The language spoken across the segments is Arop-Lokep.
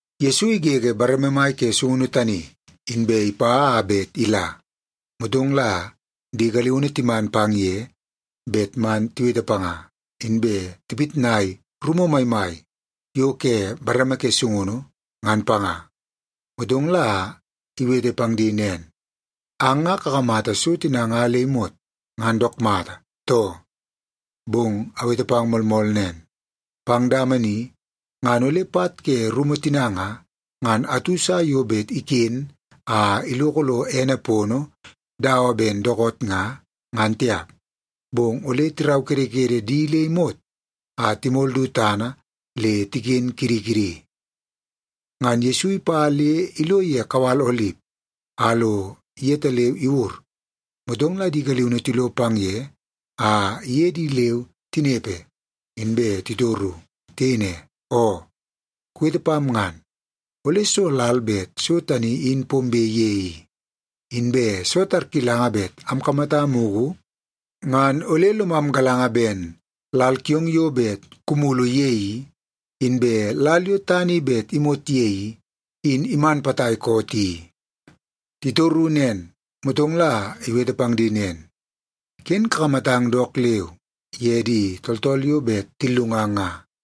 Yesu igege bareme mai ke sungunu tani, inbe ipa a bet ila. Motong la di galiunu timan pang ye bet man tiwete panga, inbe tipitnai rumu maimai yo ke bareme ke sungunu, ngan panga. Motong la iwete pang di nen, “Ang nga kakamata so tina nga le imot ngan dook mata, too? Bong awete pang moolmool nen, pang dama ni ngan ole pat ke rumu tina nga, ngan atu sa yo bet iken a iloko lo ene pono dawa ben dookoot nga, ngan tiap. Bong ole tiraukedekede di le imot a timol du tana le tiken kidi kidi.” Ngan Yesu ipa le ilo ye kawal Olip a lo yetaleu iwur, motong la di galiunu tilo pang ye a iye di leu tinepe, inbe titoru. Tiyei ne, “Oo, kuwete pam ngan, ole soo lal bet so tani in pombe ye i? Inbe soo tarkilanga bet amkamata mugu, ngan ole lomam galanga ben lal kiong yo bet kumulu ye i, inbe lal yo tana i bet imot ye i, in iman potai koot i?” Titoru nen, motong la iwete pang di nen, “Ken kakamatang dook leu ye di tooltool yo bet tillungang nga.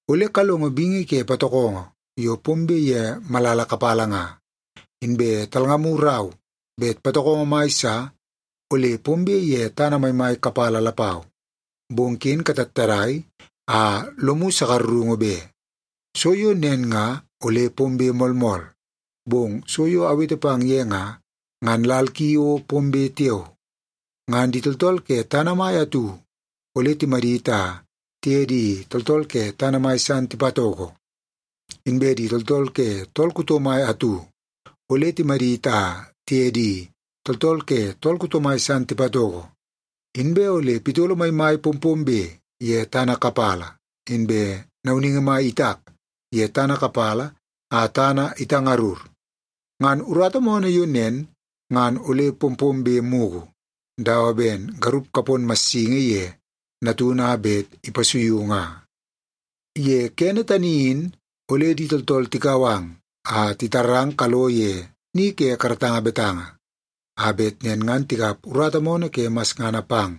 Ole kalongo bingi ke patokongo yo pombe ye malala kapala nga, inbe talngamu rau bet patokongo mai sa ole pombe ye tana maimai kapala lapau, bong ken katattadai a lomu sakarungu be. So yo nen nga ole pombe moolmool, bong so yo awete pang ye nga, ngan lal ki o pombe tiao. Ngan di tooltool ke tana mai atu ole timadit a tiye di tooltool ke tana mai san tipatoko. Inbe di tooltool ke tool kuto mai atu ole timadit a tiye di tooltool ke tool kuto mai san tipatoko. Inbe ole pitolo maimai pompombe ye tana kapala, inbe nauningi mai itak ye tana kapala a tana itangarur. Ngan urata moonoo yo nen ngan ole pompombe mugu, dawa ben garup kapon massingi ye natunu a bet ipasuiu nga. “Ye kene tani in, ole di tooltool tikau ang a titarang kalo ye ni ke karatanga betanga, a bet nen ngan tikap urata moonoo ke masngana pang,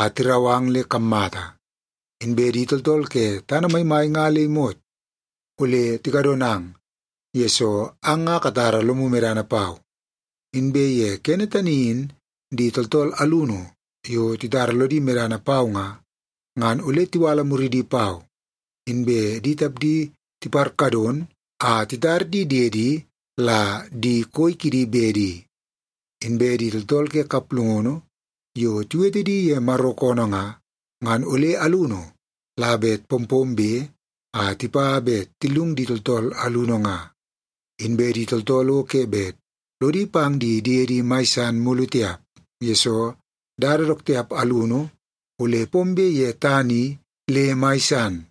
a tirau ang le kammata. Inbe di tooltool ke tana maimai nga le imot ole tikadonang, yesoo ang nga katara lomu medana pau. Inbe ye kene tani in, di tooltool alunu yo titara lodi medana pau nga, ngan ole tiwala muridi pau, inbe di tapdi tiparkadon a titar di diedi la di koi kidi bedi. Inbe di tooltool ke kaplungunu yo tiwete di ye Maro koonoo nga, ngan ole alunu la bet pompombe a tipa bet tillungu di tooltool alunu nga. Inbe di tooltool o ke bet lodi pang di diedi mai san mulu tiap, yesoo dada dook tiap alunu ole pombe ye tana i le mai san.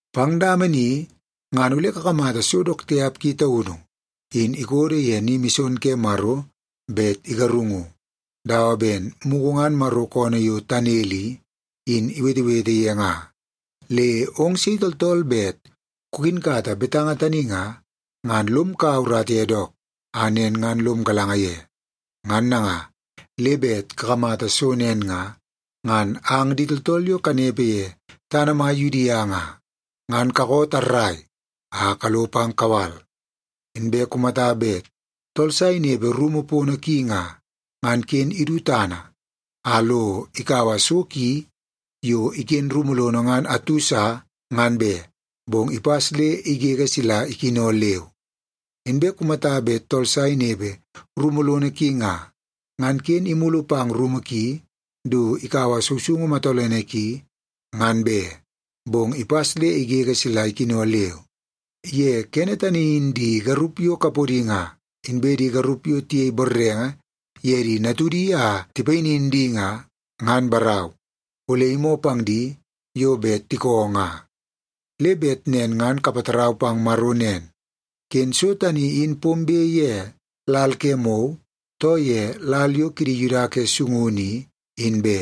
“Pang dama ni ngan ole kakamata so dook tiap ki taunu in ikodo ye ni mison ke Maro bet igarungu, dawa ben mugu ngan Maro koonoo yo Tanel i, in iwetewete ye nga. Le ong sei tooltool bet kukinkata betanga tani nga, ngan lom kaua urata ye dook, a nen ngan lom galanga ye. Ngan nanga, le bet kakamata so nen nga, ngan ang di tooltool yo kanepe ye tana mai Yudia nga, ngan kakoo tarrai a kalo pang kawal. Inbe kumata bet tool sa inepe rumu pono ki nga, ngan ken idu tana a lo ikaua so ki yo iken rumu lono ngan atu sa, ngan be, bong ipas le igege sila ikino leu. Inbe kumata bet tool sa inepe kumu lono ki nga, ngan ken imulu pang rumu ki du ikaua sousoungu matolene ki, ngan be, bong ipas le igege sila ikino leu. Ye kene tani in di garup yo kapodi nga, inbe di garup yo tiyei borrenge ye di natudi a tipayinin di nga, ngan barau, ole imoo pang di yo bet tikoo nga. Le bet nen ngan kapatarau pang Maro nen, ken so tani in pombe ye lal ke mou, too ye lal yo kidi Yuda ke sungunu i, in be.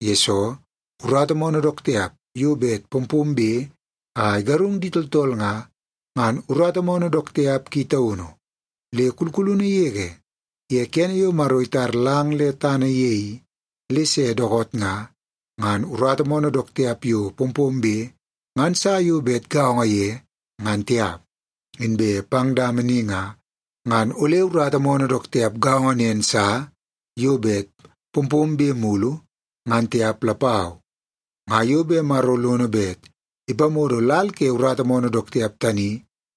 Yesoo, urata moonoo dook tiap yo bet pompombe a igarung di tooltool nga, ngan urata moonoo dook tiap ki taunu. Le kulkulunu yege ye kene yo Maro itar lang le tana ye i, le se dookoot nga, ngan urata moonoo dook tiap yo pompombe ngan sa yo bet gaongo ye, ngan tiap. Inbe pang dama ni nga, ngan ole urata moonoo dook tiap gaongo nen sa yo bet pompombe mulu, ngan tiap lapau. Nga yo bet Maro lono bet ipamodo lal ke urata moonoo dook tiap tani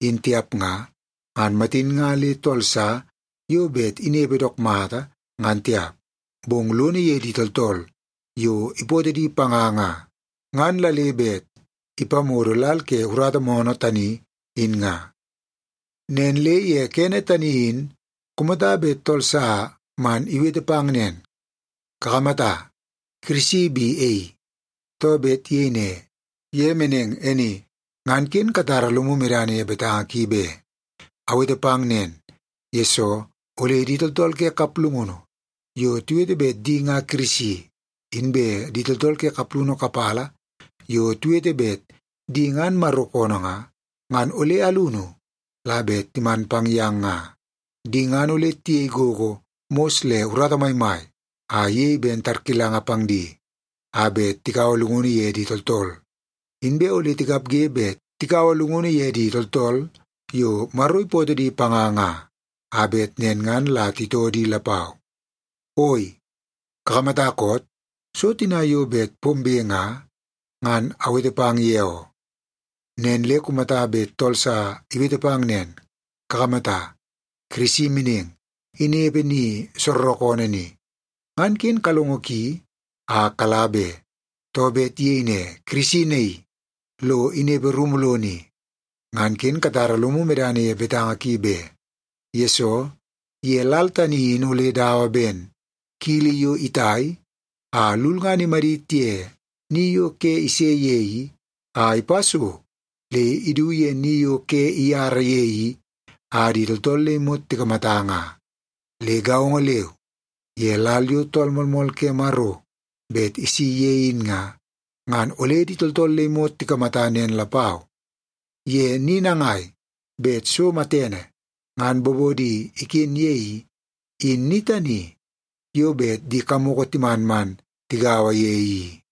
in tiap nga, ngan matin nga le tool sa yo bet inepe dook mata, ngan tiap. Bong lono ye di tooltool yo ipootoo di panga nga, ngan la le bet ipamodo lal ke urata moonoo tani in nga. “Nen le ye kene tani in, kumata bet tool sa man iwete pang nen, ‘Kakamata, Kirisi bi e i!’ too, bet iyei ne, ‘Ye meneng e ni!’ ngan ken katara lomu medana ye betanga ki be. Awete pang nen, yesoo ole di tooltool ke kaplungunu yo tiwete bet di nga Kirisi, inbe di tooltool ke kaplungunu kapala yo tiwete bet di ngan Maro koonoo nga, ngan ole alunu la bet timan pang yang nga. Di ngan ole tiyei gogo mos le urata maimai a iyei ben tarkilanga pang di, a bet tikaua llungunu ye di tooltool. Inbe ole tikapge bet tikaua llungunu ye di tooltool yo Maro ipootoo di panga nga, a bet nen ngan la titoo di lapau. Oi, kakamata koot? So tina yo bet pombe nga, ngan awete pang ye oo. “Nen le kumata bet tool sa iwete pang nen, ‘Kakamata, Kirisi meneng, inepe ni soorookoonoo ni,’ ngan ken kalongo ki a kala be. Too, bet iyei ne, ‘Kirisi naii, lo inepe rumu lono i,’ ngan ken katara lomu medana ye betanga ki be. Yesoo, ye lal tani, in ole dawa ben kili yo itai a lulngana imadit ye ni yo ke ise ye i, a ipa so le idu ye ni yo ke iyara ye i a di tooltool le imot tikamata nga. Le gaongo leu ye lal yo Tool Moolmool ke Maro bet isi ye in nga, ngan ole di tooltool le imot tikamata nen lapau. Ye ni nangai bet so matene ngan bobono iken ye i, in ni tani yo bet di kamoko timan man tigaua ye i.”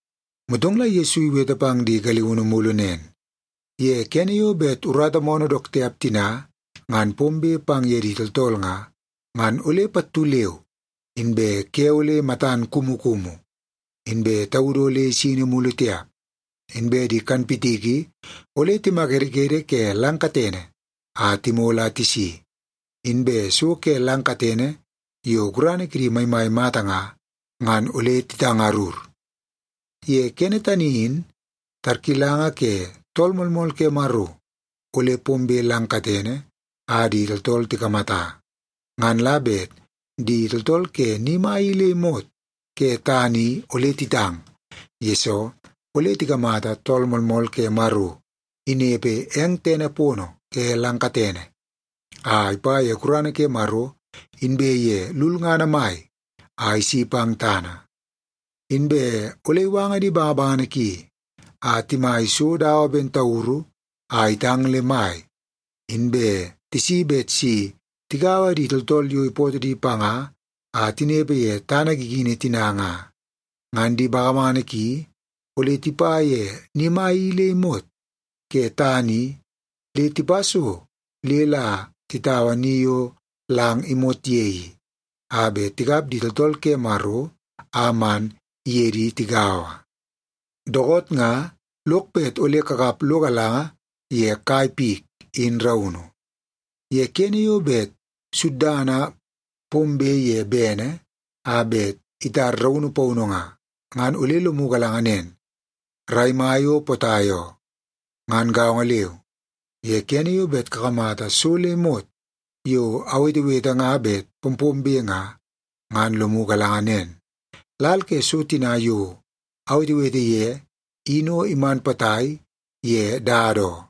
Motong la Yesu iwete pang di galiunu mulu nen, “Ye kene yo bet urata moonoo dook tiap tina ngan pombe pang ye di tooltool nga, ngan ole pattu leu inbe ‘ke ole matan kumukumu, inbe taudu ole isini mulu tiap. Inbe di kanpitiki ole timakedekede ke lang katene a timol a tisi, inbe so ke lang katene yo gurana kidi maimai mata nga, ngan ole titangarur.’ “Ye kene tani in, tarkilanga ke Tool Moolmool ke Maro, ole pombe lang katene a di tooltool tikamata. Ngan la bet di tooltool ke ni mai i le imot ke tana i ole titang, yesoo ole tikamata Tool Moolmool ke Maro inepe eng tene pono ke lang katene, a ipa ye gurana ke Maro inbe ye lulngana mai a isi pang tana. Inbe ole iwanga di bangabangana ki a timai so dawa ben tauru a itang le mai, inbe tisi bet si tigaua di tooltool yo ipootoo di panga a tinepe ye tana gigini tina nga. Ngan di bangabangana ki ole tipa ye ni mai i le imot ke tana i le tipa so le la titaua ni yo lang imot ye i, a bet tikap di tooltool ke Maro a man iye di tigaua. “Dookoot nga lok bet ole kakap lo galanga ye kai pik in raunu. Ye kene yo bet suddana pombe ye bene a bet itar raunu paunu nga, ngan ole lomu galanga nen, rai mai o potai oo. Ngan gaongo leu, ye kene yo bet kakamata so le imot yo awetewete nga bet pompombe nga, ngan lomu galanga nen, lal ke so tina yo awetewete ye in o iman potai ye dada oo.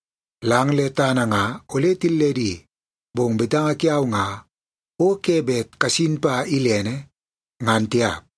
Lang le tana nga ole tilledi, bong betanga kiau nga o ke bet kasin pa ilene, ngan tiap.”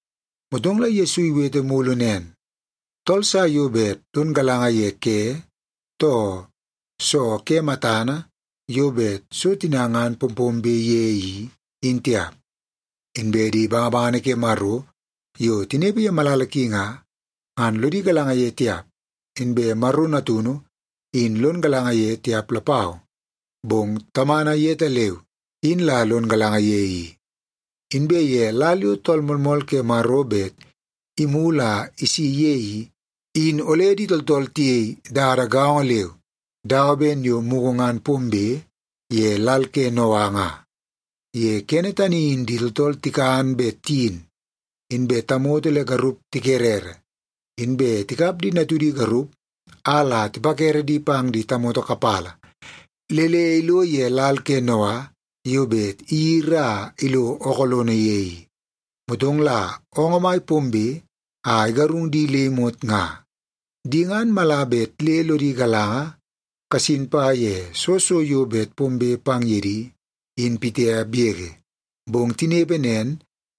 Motong la Yesu iwete mulu nen, “Tool sa yo bet lon galanga ye ke, too soo ke matana yo bet so tina ngan pompombe ye i, in tiap. Inbe di bangabangana ke Maro yo tinepe ye malala ki nga, ngan lodi galanga ye tiap, inbe Maro Natunu in lon galanga ye tiap lapau, bong Tamana yetaleu in la lon galanga ye i. Inbe ye lal yo Tool Moolmool ke Maro bet imulu a isi ye i, in ole di tooltool tiyei dada gaongo leu dawa ben yo mugu ngan pombe ye lal ke Noa nga. Ye kene tani in di tooltool tikan bet tiyin, inbe tamoto le garup tikerere, inbe tikap di natudi garup a la tipakere di pang di tamoto kapala, le le ilo ye lal ke Noa yo bet iyiri a ilo ookoo lono ye i. Motong la oongoo mai pombe a igarung di le imot nga. Di ngan mala bet le lodi galanga kasin pa ye soo so yo bet pombe pang ye di, in pitiap yege. Bong tinepe nen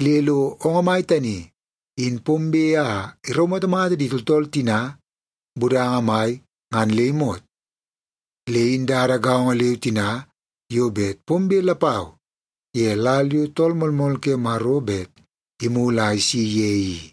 le lo oongoo mai tani in pombe a iraumatamata di tooltool tina budanga mai ngan le imot. Le in dada gaongo leu tina yo bet pombe lapau ye lal yo Tool Moolmool ke Maro bet imulu a isi ye i.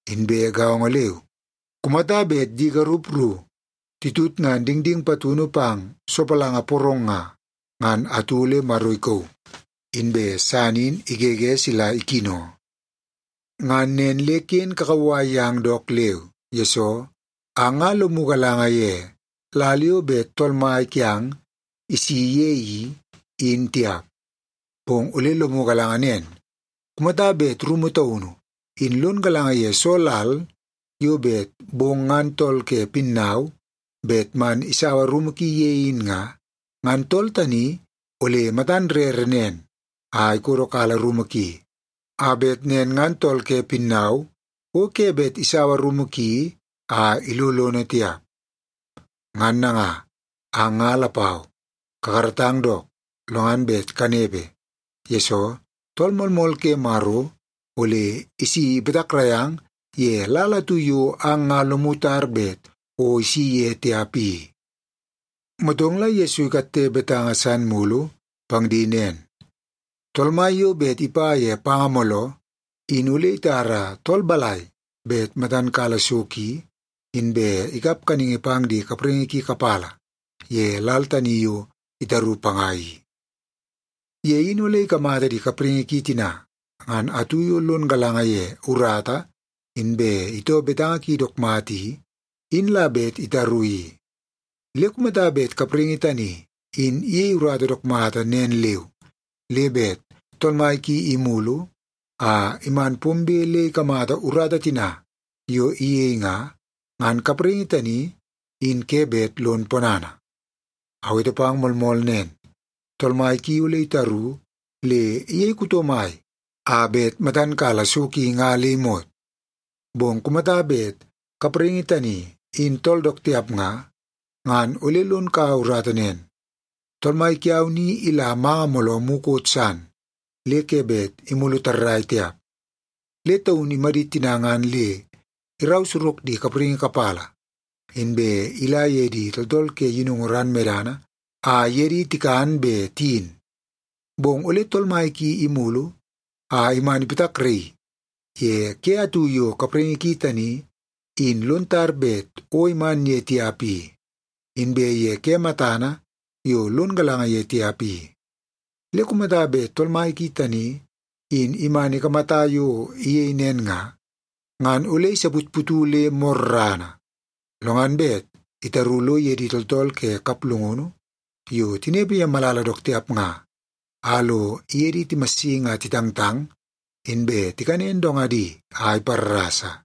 Inbe gaongo leu, kumata bet di garup ru titutngan dingding patunu pang sopalanga porong nga, ngan atu ole Maro ikauu, inbe san in igege sila ikino. “Ngan nen le ken kakauwai yang dook leu, yesoo ang nga lomu galanga ye lal yo bet Tool Mai kiang isi ye i, in tiap. Bong ole lomu galanga nen. Kumata bet rumu taunu in lon galanga ye soo lal yo bet bong ngan tool ke pinnau bet man isaua rumu ki ye in nga, ngan tool tani ole matan rere nen a ikodokala rumu ki, a bet nen ngan tool ke pinnau o ke bet isaua rumu ki a ilo lono tiap. Ngan nanga, ang nga lapau kakaratang dook, lo ngan bet kanepe, yesoo Tool Moolmool ke Maro ole isi ipatakrai ang ye lal atu yo ang nga lomu tar bet o isi ye tiap i.” Motong la Yesu ikatte betanga san mulu pang di nen, “Tool mai yo bet ipa ye panga mooloo, in ole itara tool balai bet matan kala so ki, inbe ikap kaningi pang di kapraingi ki kapala ye lal tani yo itaru panga i? Ye in ole ikamata di kapraingi ki tina ngan atu yo lon galanga ye urata inbe itoo betanga ki dook mata i, in la bet itaru i. Le kumata bet kapraingi tani in iyei urata dook mata nen leu, le bet tool mai ki imulu a iman pombe le ikamata urata tina yo iyei nga, ngan kapraingi tani in ke bet lon ponana. Awete pang moolmool nen, tool mai ki ole itaru le iyei kuto mai a bet matan kala so ki nga le imot. Bong kumata bet kapraingi tani in tool dook tiap nga, ngan ole lon kaua urata nen, ‘Tool mai kiau ni ila manga mooloo mukot san le ke bet imulu tarrai tiap.’ Le taun imadit tina ngan le irau sorok di kapraingi kapala, inbe ila ye di tooltool ke yinungu ran medana, a iye di tikan be tiyin. Bong ole tool mai ki imulu a iman ipatakraii ye ke atu yo kapraingi ki tani in lon tar bet o iman ye tiap i, inbe ye ke matana yo lon galanga ye tiap i. Le kumata bet tool mai ki tani in iman ikamata yo iyei nen nga, ngan ole isaputputu le morrana, lo ngan bet itaru lo ye di tooltool ke kaplungunu yo tinepe ye malala dook tiap nga, a lo iye di timassingi a titangtang, inbe tikanen dongadi a iparrasa.”